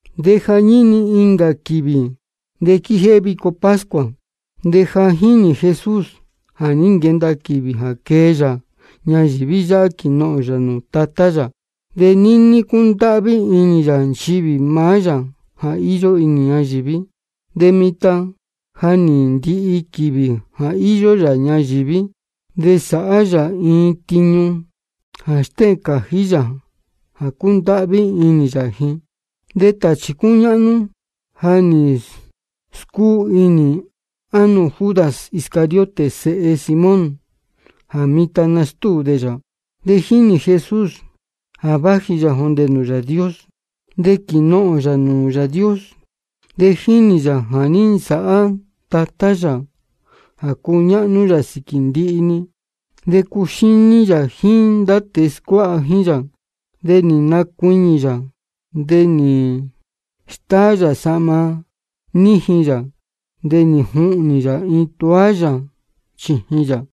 De jañíni incā quīvī de quijéhé vico pascua. De ja jínī Jesús jā ní nquenda quīvī jā quee yā ñayīví yáhá quīnohōn yā nūū Tatá yā. De níní cúndáhví inī yā nchivī maá yā jā íyó inī ñayīví. De mitan jā ní ndihi quīvī jā íyó yā ñayīví, de sāhá yā iin tiñu jā stéhēn cājí yā jā cúndáhví inī yā ji. De tāchī cúñáhnú ja nī scúu inī ánō Judas Iscariote sēhe Simón, jā mitan nastúu dē yā. De jínī Jesús jā vāji yā jōndē nūū Yāā Dios, de quīnohōn yā nūū Yāā Dios. De jínī yā jā ní nsāhá Tatá yā jā cúñáhnú yā sīquī ndihi-ni. De cúxíní yā jíín ndá tēe scuáha jíín yā, de nī nacuiñī yā. De nī stáá yā sahma níjin yā, de nī juhnī yā iin toalla chījin yā.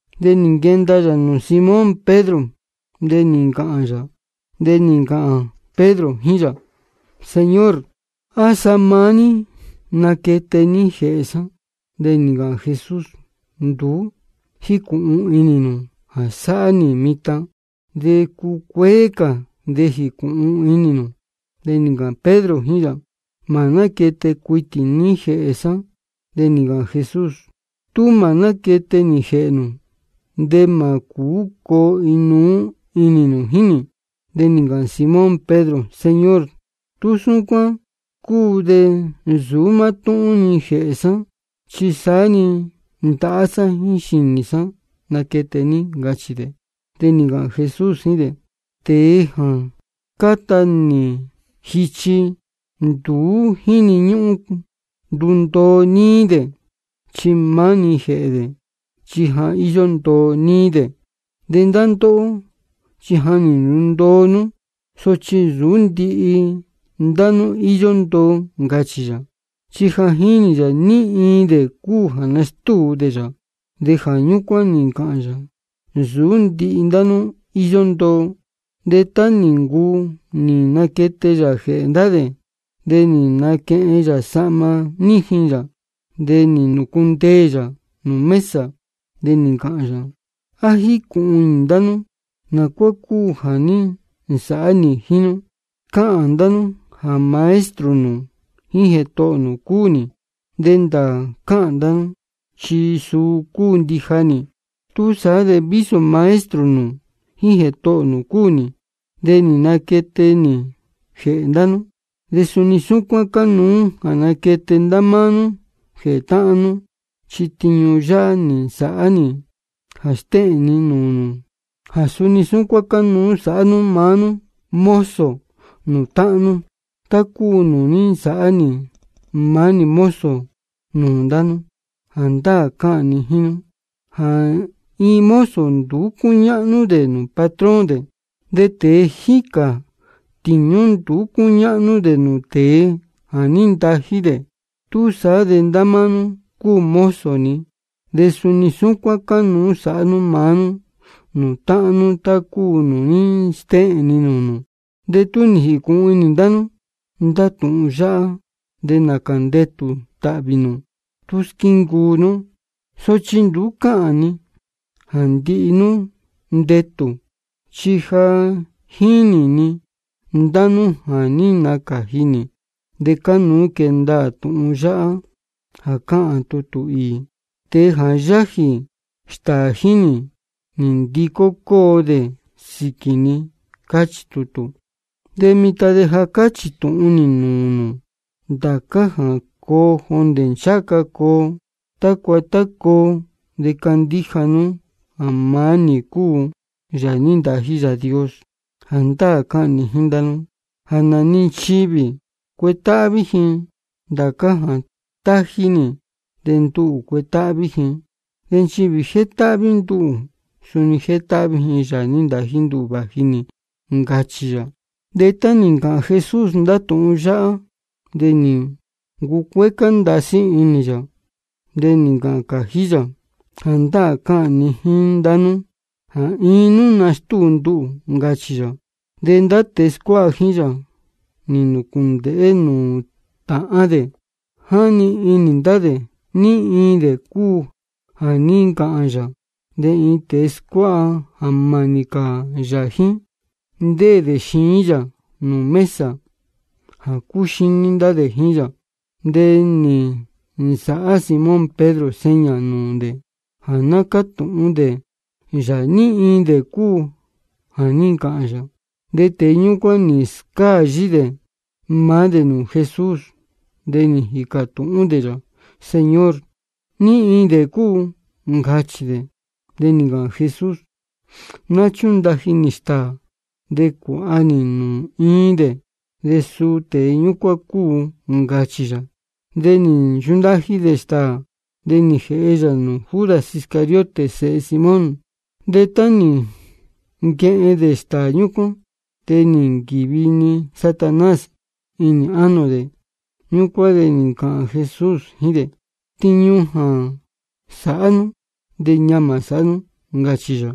De nī nquenda yā nūū Simón Pedro. De nī ncāhān Pedro jíín yā: Señor, ¿á sa maá ní naquete ní jēhē sá? De nī ncāhān Jesús: Nduú jícūhun inī nū jā sáhá nī mitan, de cúcuéé cā de jīcūhun inī nū. De nī ncāhān Pedro jíín yā: Mā náquete cuitī ní jēhē sá. De nī ncāhān Jesús: Tú mā náquete nī jēhē nū, de mā cūú coo inuú inī nū jíín nī. De nī ncāhān Simón Pedro: Señor, tú súcuán cúu de nsūú mátúhún-ni jēhē sá, chi saá-ni ndahá sá jíín xīnī sá naquete ní, ncachī dē. De nī ncāhān Jesús jíín dē: Tēe jā cáta nī jichi, nduú jíni ñúhún ndundoo níí dē, chi maá-ni jēhē dē, chi ja íyó ndoo níí dē. De ndá ndóhó, chi ja nī ndundoo nú. Sochi nsūú ndihi ndá nú íyó ndoo, ncachī yā. Chi ja jínī yā ní iin dē cúu jā nastúu dē yā, de jā ñúcuán nī ncāhān yā: Nsūú ndihi ndá nú íyó ndoo. De tá nī ncuu nī naquete yā jēhē ndá dē, de nī naquehen yā sahma níjin yā, de nī nūcundeē yā nūū mesa. De nī ncāhān yā: ¿A jícūhun inī ndá nú nā cuá cúu jā ní nsāhá nī jíín nú? Cáhān ndá nú jā Maestro nū jíín Jētohō nū cúu nī, de ndāā cáhān ndá nú, chi suu cúu ndija nī. Túsaá de vísō Maestro nū jíín Jētohō nū cúu nī, de nī naquete nī jēhē ndá nú, de suni súcuán cánuú jā naquete ndá máá nú jēhē táhán nú. Chi tiñu yáhá nī nsāhá nī jā stéhēn ni nūū nū jā suni súcuán cánuú sāhá nú maá nú mozo nūū táhán nú, tá cúu nūū ní nsāhá nī maá nī mozo nūū ndá nú. Jāndáā cáhān ni jíín nú jā iin mozo nduú cúñáhnú dē nūū patrón dē, de tēe jíca tiñu nduú cúñáhnú dē nūū tēe jā ní ntají dē. Túsaá de ndá máá nú cúu mozo ni, de suni súcuán cánuú sāhá nú maá nú nūū táhán nú tá cúu nūū ní stéhēn ni nūū nū. De tú nī jīcūhun inī ndá nú ndá tūhun yáhá, de nācā ndetū tāhvī nū tú squíncuu nú. Sochi nduú cáhān ni jā ndihi nú ndetū, chi ja jínī ni ndá nú jā ní nacāji nī. De cánuú quee ndaā tūhun yáhá jā cáhān tutū īī: Tēe yájī stāā jíín nī, nī ndicó cóo dē sīquī ni, cáchī tutū. De mitan de ja cáchī tūhun nī nūū nū ndācá jā coo jondē ncháha ca coo, tácua tá coo, de candíja nú jā maá nī cúu Yāā nī ntají Yāā Dios. Jāndáā cáhān ni jíín ndá nú jā nā-ni nchivī cuetáhví ji ndācá jā tají nī, de nduhū cuetáhví ji. De nchivī jétáhví nduhū, suni jétáhví ji Yāā nī ntají nduhū vāji nī, ncachī yā. De tá nī ncāhān Jesús ndá tūhun yáhá, de nī ncucuécá ndasí inī yā. De nī ncāhān cājí yā: Jāndáā cáhān ni jíín ndá nú jā iin nú nastúu nduhū, ncachī yā. Ñúcuán de ndá tēe scuáha jíín yā, nī nūcūndēhé nūū tāhán dē, jáni inī ndá dē ní iin dē cúu jā ní ncāhān yā. De iin tēe scuáha jā mānī cā yā jíín, ndéē dē xiín yā nūū mesa jā cúxíní ndá dē jíín yā. De nī nsāhá Simón Pedro seña nūū dē jā ná cátūhún dē yā ní iin dē cúu jā ní ncāhān yā. De tēe ñúcuán nī scáyí dē maá dē nūū Jesús, de nī jīcā tūhún dē yā: Señor, ¿ní iin dē cúu? ncachī dē. De nī ncāhān Jesús: Ná chúndaji nī stāā de cuāha nī nūū iin dē, de suu tēe ñúcuán cúu, ncachī yā. De nī nchundaji yā stāā, de nī jēhe yā nūū Judas Iscariote sēhe Simón. De tá nī nquehen dē stāā ñúcuán, de nī nquīvi-ni Satanás inī ánō dē. Ñúcuán de nī ncāhān Jesús jíín dē: Tiñu jā sāhá nú, de ñamā sāhá nú, ncachī yā.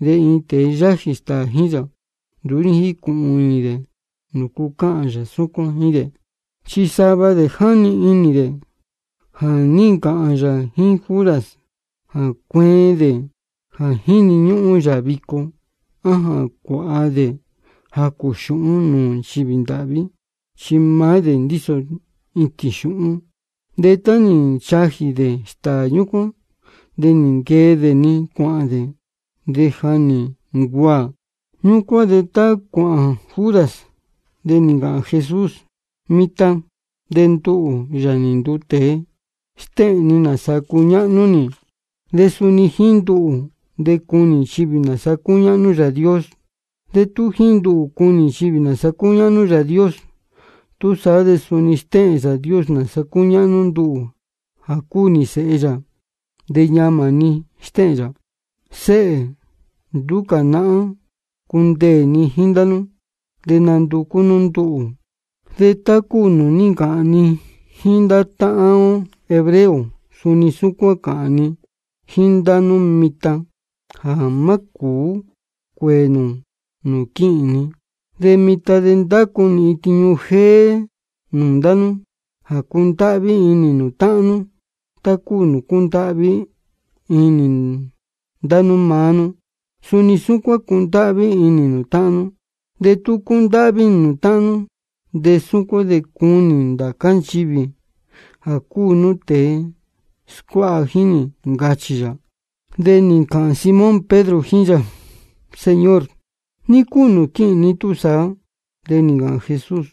De ni iin tēe yájī stāā jíín yā, nduú ní jícūhun inī dē nūcu cáhān yā súcuán jíín dē. Chi sava dē jáni inī dē jā ní ncāhān yā jíín Judas jā cueen dē jā jíni ñúhún yā vico, á jā cuāha dē jacū xūhún nūū nchivī ndāhví. Chi maá dē ndíso itīn xūhún. De tá nī nchajī dē stāā ñúcuán, de nī nquee dē-ni cuāhān dē. De ja nī ncuaā. Ñúcuán de tá cuāhān Judas, de nī ncāhān Jesús: Mitan de nduhū, Yāā nī nduu tēe, stéhēn ni nāsa cúñáhnú nī, de suni jíín nduhū de cunī nchivī nāsa cúñáhnú Yāā Dios. De tú jíín nduhū cunī nchivī nāsa cúñáhnú Yāā Dios, túsaá de suni stéhēn Yāā Dios nāsa cúñáhnú nduhū jā cúu nī Sēhe yā. De ñamā-ni stéhēn yā. Séhē, nduú cā nahán cundeē ni jíín ndá nú. De nanducú nú nduhū, de tá cúu nūū ní ncāhān ni jíín ndá táhán ó hebreo, suni súcuán cáhān ni jíín ndá nú mitan jā mā cūú cuēē nū nūū quíhīn ni. De mitan de ndácu nī iin tiñu jéé nūū ndá nú, jā cundáhví inī nū táhán nú. Tá cúu nūū cúndáhví inī ni ndá máá nú, suni súcuán cundáhví inī nū táhán nú. De tú cundáhví inī nū táhán nú, de súcuán de cunī ndācá nchivī jā cúu nú tēe scuáha jíín nī, ncachī yā. De nī ncāhān Simón Pedro jíín yā: Señor, ¿ní cúu nūū quíhīn ní túsaá? De nī ncāhān Jesús: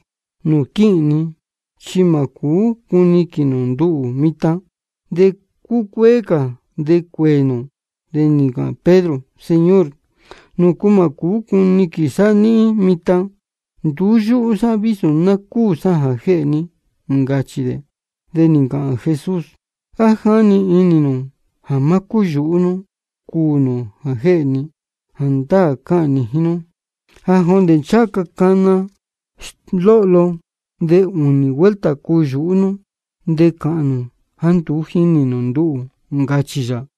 Nūū quíhīn ni chi mā cūú cuniquīn nū nduhū mitan, de cúcuéé cā de cuēē nū. De nī ncāhān Pedro: Señor, ¿nūcu mā cūú cuniquīn sá níhín mitan? Nduú yúhú sá vísō cuū sá jā jéhē ní, ncachī dē. De nī ncāhān Jesús: ¿A jáni inī nū jā má cúyūhú nú cuū nū jā jéhē ni? Jāndáā cáhān ni jíín nú jā jondē ncháha ca cana lohló, de ūnī vuelta cuyūhú nú de cāhān nū jāá nduú jínī nū nduhū, ncachī yā.